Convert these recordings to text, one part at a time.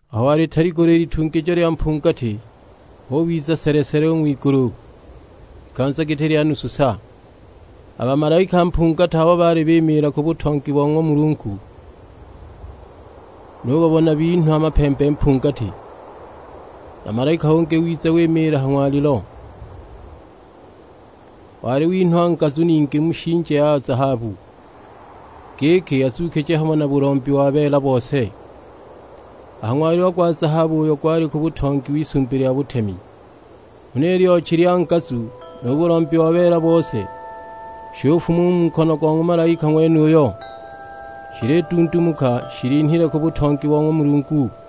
Aho walitaligula i litungijo lya mpungati hubiza sele-sele u ng'wigulu, ikanza giti lya nusu sa! A bamalaika mpungati abo baali bimiila ku butongi bo ng'wa Mulungu, nubabona binhwa mapembe mpungati. Na malaika ungi wiza wimiila ha ng'walilo; wali winhwa ngazu ningi mu shinje ya zahabu, giki azuukije hamo na bulombi wa beela bose, a ha ng'walilo gwa zahabu uyo gwali ku butongi w'Isumbi lya butemi. Huna i lyochi lya ngazu nu bulombi wa beela bose, shufuma u mu nkono go ng'wa malaika ng'wenuyo, shilidundumuka shilinhile ku butongi bo ng'wa Mulungu.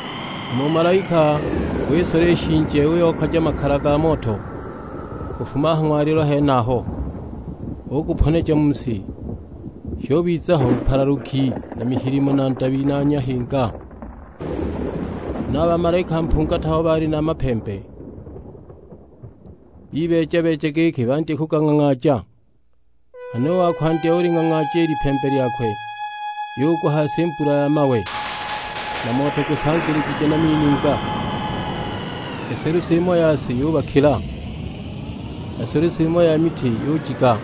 Hama u malaika wisola i shinje uyokaja makala ga moto kufuma a ha ng'walilo henaho, uguponeja mu si; shubiza ho bupalaluki na mihilimo na ndabi na nyahinga. Huna a bamalaika mpungati abo baali na mapembe, bibeeja-beeja giki bandye kugang'ang'aaja. Nghana u wa kwandya uling'ang'aaja i lipembe lyakwe; yugwa a ha si mbula ya mawe, na moto gusangiligije na mininga; selusi imo ya si yubakila, na selusi imo ya miti yujiga,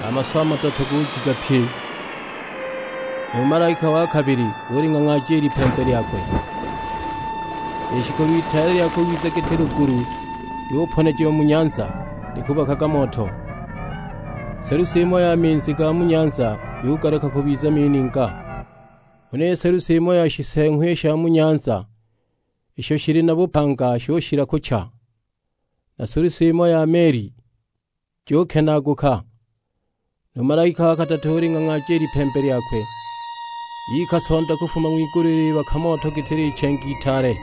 na a maswa a madoto gujiga pye. Nu malaika wa kabili uling'ang'aaja i lipembe lyakwe; lishikolo itaale lya kubiza giti lugulu lyuponejiwa mu nyanza likubakaga moto. Selusi imo ya minzi ga mu nyanza yugaluka kubiza mininga. Huna selusi imo ya shiseeng'wa i sha mu nyanza isho shili na bupanga shushila kucha, na selusi imo ya meli jukenaaguka. Nu malaika wa kadatu uling'ang'aaja i lipembe lyakwe; yika Sonda kufuma ng'wigulu ilibaka moto giti lichenge itaale.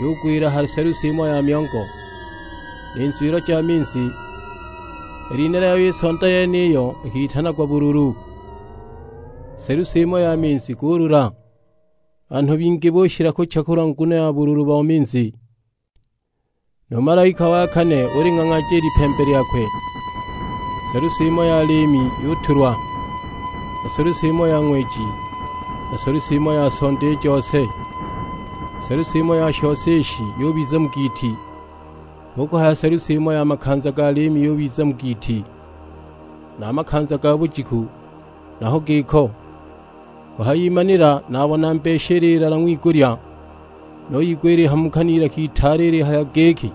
Yugwila ha selusi imo ya myongo, ni nzwilo ja minzi. I lina lyayo i Sonda yeniyo ikitanagwa Bululu. Selusi imo ya minzi gulula; banhu bingi bushila kucha kulwa nguno ya bululu bo minzi. Nu malaika wa kane uling'ang'aaja i lipembe lyakwe; selusi imo ya liimi yutulwa, na selusi imo ya ng'weji, na selusi imo ya sonda i jose. Selusi imo ya shose ishi yubiza mu giiti; hu kuhaya selusi imo ya makanza ga liimi yubiza mu giiti; na a makanza a ga bujiku naho giko. Kuhayimanila nabona mbeshi ililala ng'wigulya, nuyigwa ilihamuka n'ilaka itaale ilihaya giki,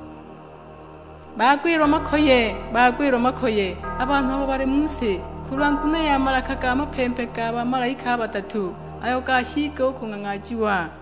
"Bagwilwa makoye, bagwilwa makoye a banhu abo bali mu si kulwa nguno ya malaka ga mapembe ga bamalaika a badatu, ayo gashiiga u kung'ang'aajiwa!"